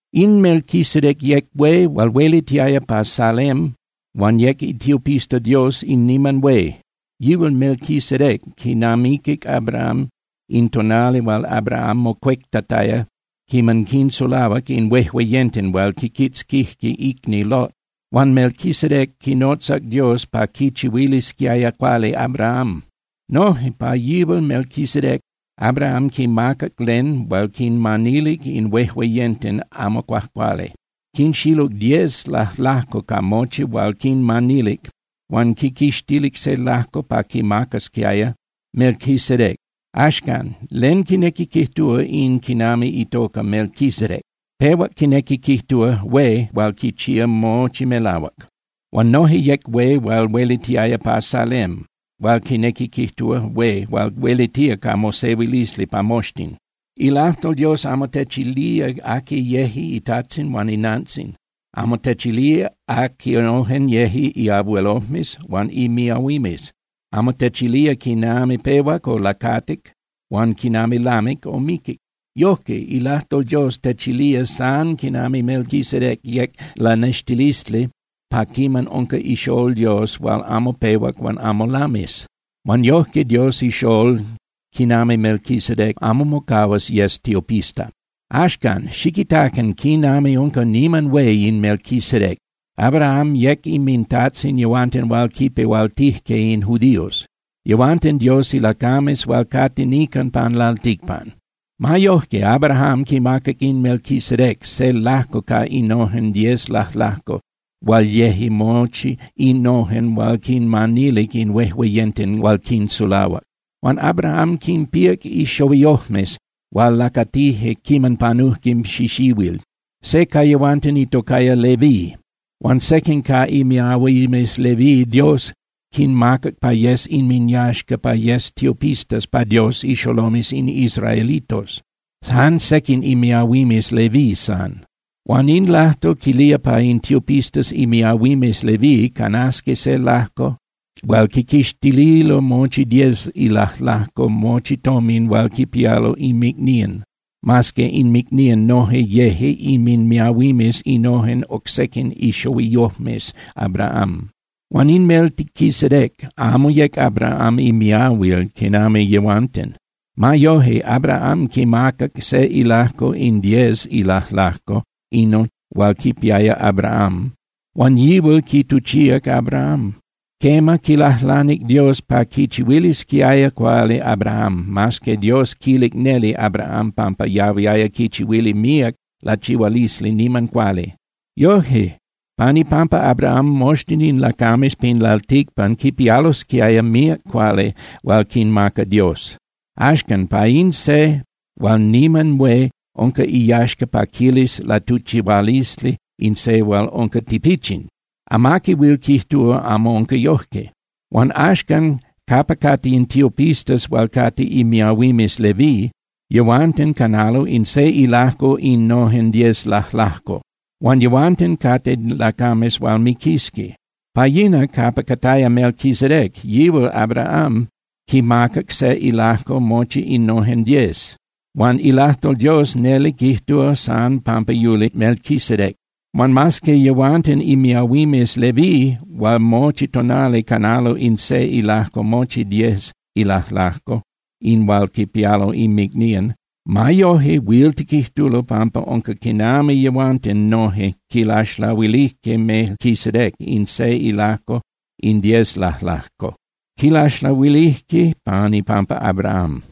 In Melquisedec yec hué hual huelitiaya pa Salem huan yec itiopista Dios in niman hué. Yihual Melquisedec quinamiquic Abraham in tonali hual Abraham mocuectataya quiman quinsulahuac in huejueyenten hual quiquitzquijque icni Lot. Huan Melquisedec quinotzac Dios pa quichihuilisquiaya cuali Abraham. Noje pa yihual Melquisedec, Abraham quimacac len hual quinmanilic in huejueyenten amo cuajcuali. Quinxiluc diez lajlajco ca mochi hual quinmanilic huan quiquixtilic se lajco pa quimacasquiaya Melquisedec. Axan, ¿len quinequi quijtúa in quinami itoca Melquisedec? Pehua quinequi quijtúa “hué hual quichía mochi melahuac”. Huan noje yec hué hual huelitiaya pa Salem hual quinequi quijtúa “hué hual huelitía ca mosehuilisli pa moxtin”. Ilajtol Dios amo techilía aqui yeje itajtzin huan inantzin, amo techilía aquinojen yeje iabuelojmes huan imiahuimes. Amo techilía quiman pehuac o lacatic huan quiman lamic o miquic. Yojque, ilajtol Dios techilía san quinami Melquisedec yec lanextilisli pa quinami unca iXolol Dios hual amo pehuac huan amo lamis. Huan yojque Dios iXolol quinami Melquisedec amo mocahuas yes tiopista. Axcan, ¡xiquitacan quinami unca niman hué in Melquisedec! Abraham yec inmintajtzin yehuanten hual quipehualtijque in judíos. Yehuanten Dios ilacames hual cate nican pan lalticpan. Ma yoje Abraham quimacac in Melquisedec se lajco ca innojen diez lajlajco hual yeje mochi innojen hual quinmanilic in huejueyenten hual quinsulahuac. Huan Abraham quinpíac ixohuiyojmes hual lacatijque quiman panujque xixihuil. Se ca yehuanten itocaya Leví. Huan sequin ca imiahuimes Leví Dios quinmacac pa yes inminyaxca pa yesqui tiopistas pa Dios ixolomes in israelitos, jan sequin imiahuimes Leví san. Huan in lajtol quilía pa in tiopistas imiahuimes Leví canasqui se lajco hual quiquixtililo mochi diez ilajlajco mochi tomin hual quipialo inmicnían, mas que inmicnían noje yeje inminmiahuimes innojen oc sequin ixohuiyojmes Abraham. Huan in Melquisedec amo yec Abraham imiahuil quinami yehuanten. Ma yoje, Abraham quimacac se ilajco in diez ilajlajco inon hual quipiaya Abraham, huan yihual quituchíac Abraham. Quema, quilajlanic Dios pa quichihuilisquiaya cuali Abraham, mas que Dios quilic neli Abraham pampa yahuiaya quichihuili míac lachihualisli niman cuali. Yoje pan ipampa Abraham, moxtin in lacames pin lalticpan quipialosquiaya míac cuali hual quinmaca Dios. Axcan, pa in se hual niman hué unca iyaxca pa quilis latuchihualisli in se hual unca tipichin. Amaqui huil quijtúa amo unca yojque. Huan axcan capa cate in tiopistas hual cate imiahuimes Leví, yehuanten canalo in se ilajco innojen diez lajlajco. Huan yehuanten cate lacames hual miquisqui. Pa yina capa cataya Melquisedec, yihual Abraham quimacac se ilajco mochi innojen diez, huan ilajtol Dios neli quijtúa san pampa yuli Melquisedec. Huan mas que yehuanten imiahuimes Leví hual mochi tonali canalo in se ilajco mochi diez ilajlajco in hual quipialo inmicnían, ma yoje huil tiquijtulo pampa unca quinami yehuanten noje quilaxlahuilijque Melquisedec in se ilajco in diez lajlajco. Quilaxlahuilijque pan ipampa Abraham.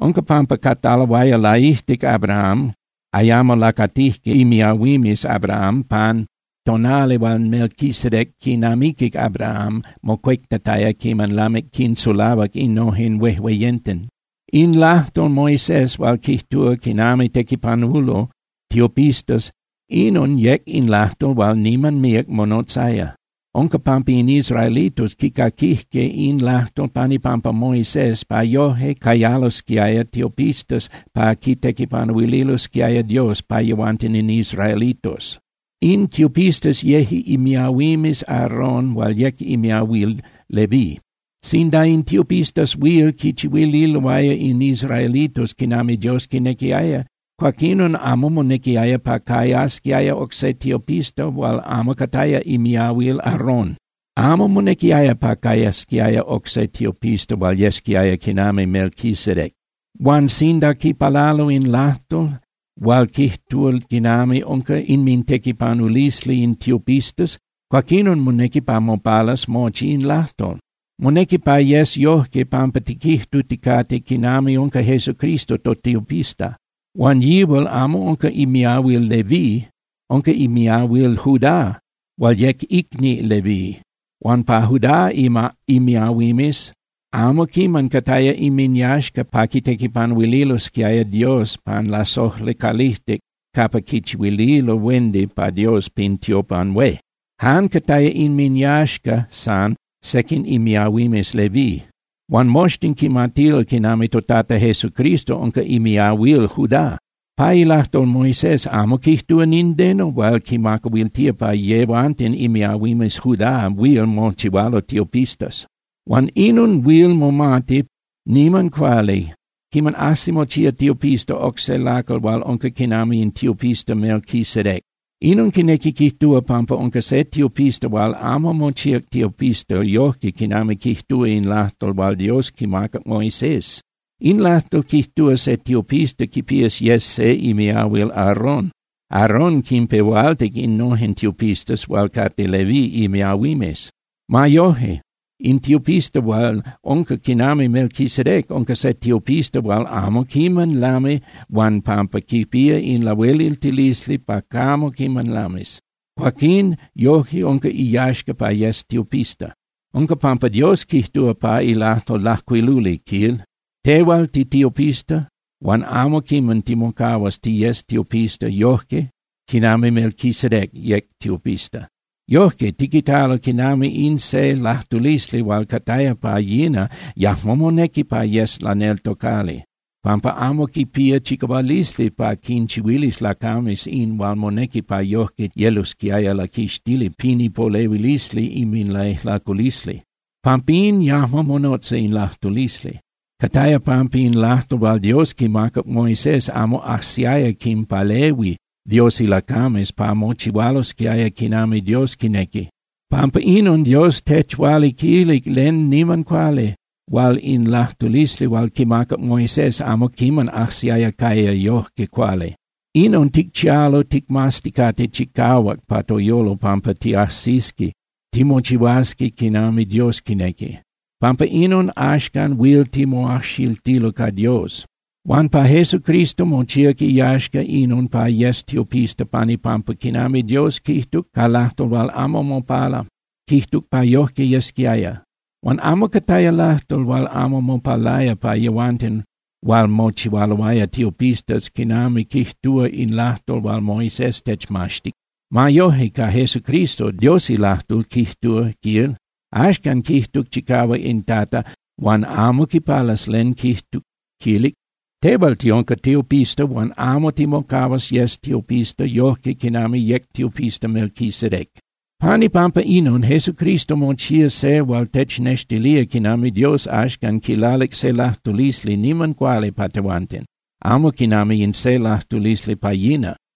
Unca pampa cataloaya laijtic Abraham, ayamo lacatijque imiahuimes Abraham pan tonali hual Melquisedec quinamiquic Abraham mocuectataya quiman lamic quinsulahuac innojen huejueyenten. In ilajtol Moisés hual quijtúa quinami tequipanulo tiopistas, inon yec in lajtol hual niman míac monotzaya. Unca pampa in israelitos quicaquijque in lajtol pan ipampa Moisés pa yojque cayalosquiaya tiopistas pa quitequipanuililosquiaya Dios pa yehuanten in israelitos. In tiopistas yeje imiahuimes Aarón hual yec imiahuil Leví. Sinda in tiopistas huil quichihuililoaya in israelitos quinami Dios quinequiaya, cuaquinon amo monequiaya pa cayasquiaya oc se tiopista hual amo cataya imiahuil Aarón. Amo monequiaya pa cayasquiaya oc se tiopista hual yesquiaya quinami Melquisedec. Huan sinda quipalalo in lajtol hual quijtúa quinami unca inmintequipanulisli in tiopistas, cuaquinon monequi pa mopalas mochi in lajtol. Monequi pa yes yojque pampa tiquijtuticate quinami unca Jesucristo totiopista. Huan yihual amo unca imiahuil Leví. Unca imiahuil Judá hual yec icni Leví. Huan pa Judá imiahuimes amo quiman cataya inminyaxca pa quitequipanuililosquiaya Dios pan lasojli calijtic capa quichihuililo huendi pa Dios pin tiopan hué. Jan cataya inminyaxca san sequin imiahuimes Leví. Huan moxtin quimatilo quinami toTata Jesucristo unca imiahuil Judá. Pa ilajtol Moisés amo quijtúa nindeno hual quimacahuiltía pa yehuanten imiahuimes Judá huil mochihualo tiopistas. Huan inon huil momati niman cuali quiman ajsi mochía tiopista oc se lacal hual unca quinami in tiopista Melquisedec. Inon quinequi quijtúa pampa unca se tiopista hual amo mochíac tiopista yojque quinami quijtúa in lajtol hual Dios quimacac Moisés. In lajtol quijtúa se tiopista quipías yes se imiahuil Aarón. Aarón quinpehualtic innojen tiopistas hual cate Leví imiahuimes. Ma yoje, in tiopista hual unca quinami Melquisedec unca se tiopista hual amo quiman lami huan, pampa quipía in lahueliltilisli pa camo quiman lamis, cuaquín yoje unca iyaxca pa yes tiopista. Unca pampa Dios quijtúa pa ilajtol lajcuiluli, quil: Tehual, titiopista huan amo quiman timocahuas tiyes tiopista yojque quinami Melquisedec yec tiopista. Yojque tiquitalo quinami in se lajtulisli hual cataya pa yina yajmo monequi pa yes laneltocali, pampa amo quipía chicahualisli pa quinchihuilis lacames in hual monequi pa yojque yelosquiaya laquixtili pin ipolehuilisli inminlaijlaculisli. Pampín yajmo monotza in lajtulisli. Cataya pampa in lajtol hual Dios quimacac Moisés amo ajsiaya quinpalehui Dios ilacames pa mochihualosquiaya quinami Dios quinequi. Pampa inon, Dios techualiquilic len niman cuali hual in lajtulisli hual quimacac Moisés amo quiman ajsiaya caya yojque cuali. Inon ticchialo ticmazticate chicahuac pa toyolo pampa tiajsisqui timochihuasqui quinami Dios quinequi. Pampa inon, axcan huil timoajxiltilo ca Dios. Huan pa Jesucristo, mochíac iyaxca inon pa yes tiopista pan ipampa quinami Dios quijtuc ca lajtol hual amo mopala, quijtuc pa yojque yesquiaya. Huan amo cataya lajtol hual amo mopalaya pa yehuanten hual mochihualoaya tiopistas quinami quijtúa in lajtol hual Moisés techmaxtic. Ma yoje, ca Jesucristo, Dios ilajtol quijtúa, quil: Axcan quijtuc chicahuac in Tata huan amo quipalas len quijtuc, quilic: “Tehual tiunca tiopista huan amo timocahuas yes tiopista yojque quinami yec tiopista Melquisedec.” Pan ipampa inon, Jesucristo mochía se hual technextilía quinami Dios axcan quilalic se lajtulisli niman cuali pa tehuanten, amo quinami in se lajtulisli pa yina.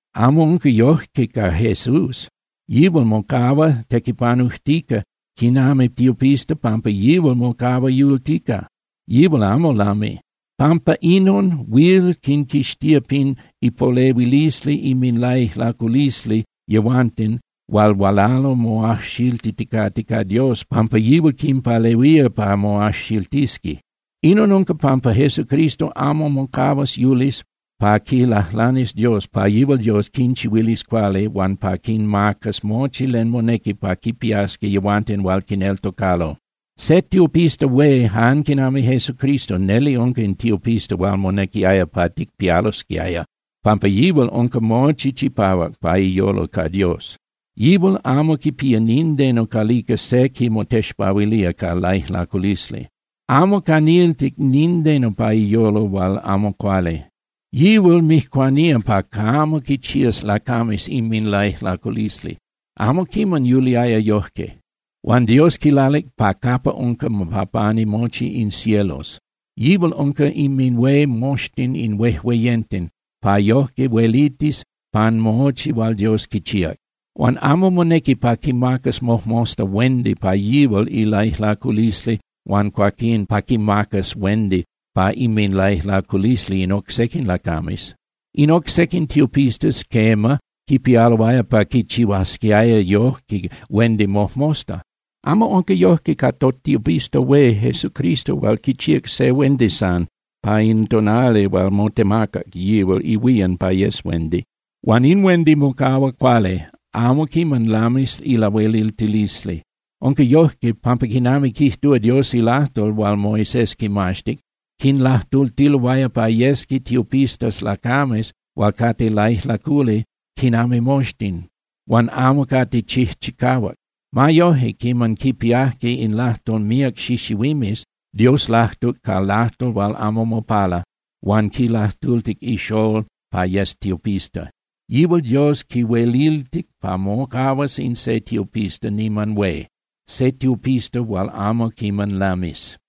Amo unca yoje ca Jesús. Yihual mocahua tequipanujtica quinami tiopista pampa yihual mocahua yultica, yihual amo lami. Pampa inon huil quinquixtía pin ipolehuilisli inminlaijlaculisli yehuanten hual hualalo moajxiltiticate ca Dios pampa yihual quinpalehuía pa moajxiltisqui. Inon unca pampa Jesucristo amo mocahuas yulis pa quilajlanis Dios pa yihual Dios quinchihuilis cuali huan pa quinmacas mochi len monequi pa quipiasqui yehuanten hual quineltocalo. Se tiopista hué jan quinami Jesucristo neli unca in tiopista hual monequiaya pa ticpialosquiaya, pampa yihual unca mochi chipahuac pa iyolo ca Dios. Yihual amo quipía nindeno calica se quimotexpahuilía ca laijlaculisli. Amo caniltic nindeno pa iyolo hual amo cuali. Yihual mijcuanía pa camo quichías lacames inminlaijlaculisli, amo quiman yuliaya yojque. Huan Dios quilalic pa capa unca pa pani mochi in cielos. Yihual unca inminhué moxtin in huejueyenten pa yojque huelitis pan mochi hual Dios quichíac. Huan amo monequi pa quimacas mojmosta huendi pa yihual ilaijlaculisli huan cuaquín pa quimacas huendi pa inminlaijlaculisli in oc sequin lacames. In oc sequin tiopistas, quema, quipialo pa quichihuasqui yojque huendi mojmosta. Amo unca yojque ca totiopista hué Jesucristo hual quichíac se huendi san pa in tonali hual motemacac yihual ihuían pa yes huendi. Huan in huendi mocahua cuali, amo quiman lamis ilahueliltilisli. Unca yojque, pampa quinami quijtúa Dios ilajtol hual Moisés quimaxtic, quinlajtultiloaya pa yesqui tiopistas lacames hual cate laijlaculi quinami moxtin, huan amo cate chijchicahuac. Ma yoje, quiman quipiajque in lajtol míac xixihuimes, Dios lajtuc ca lajtol hual amo mopala huan quilajtultic iXolol pa yes tiopista. Yihual Dios quihueliltic pa mocahuas in se tiopista niman hué, se tiopista hual amo quiman lamis.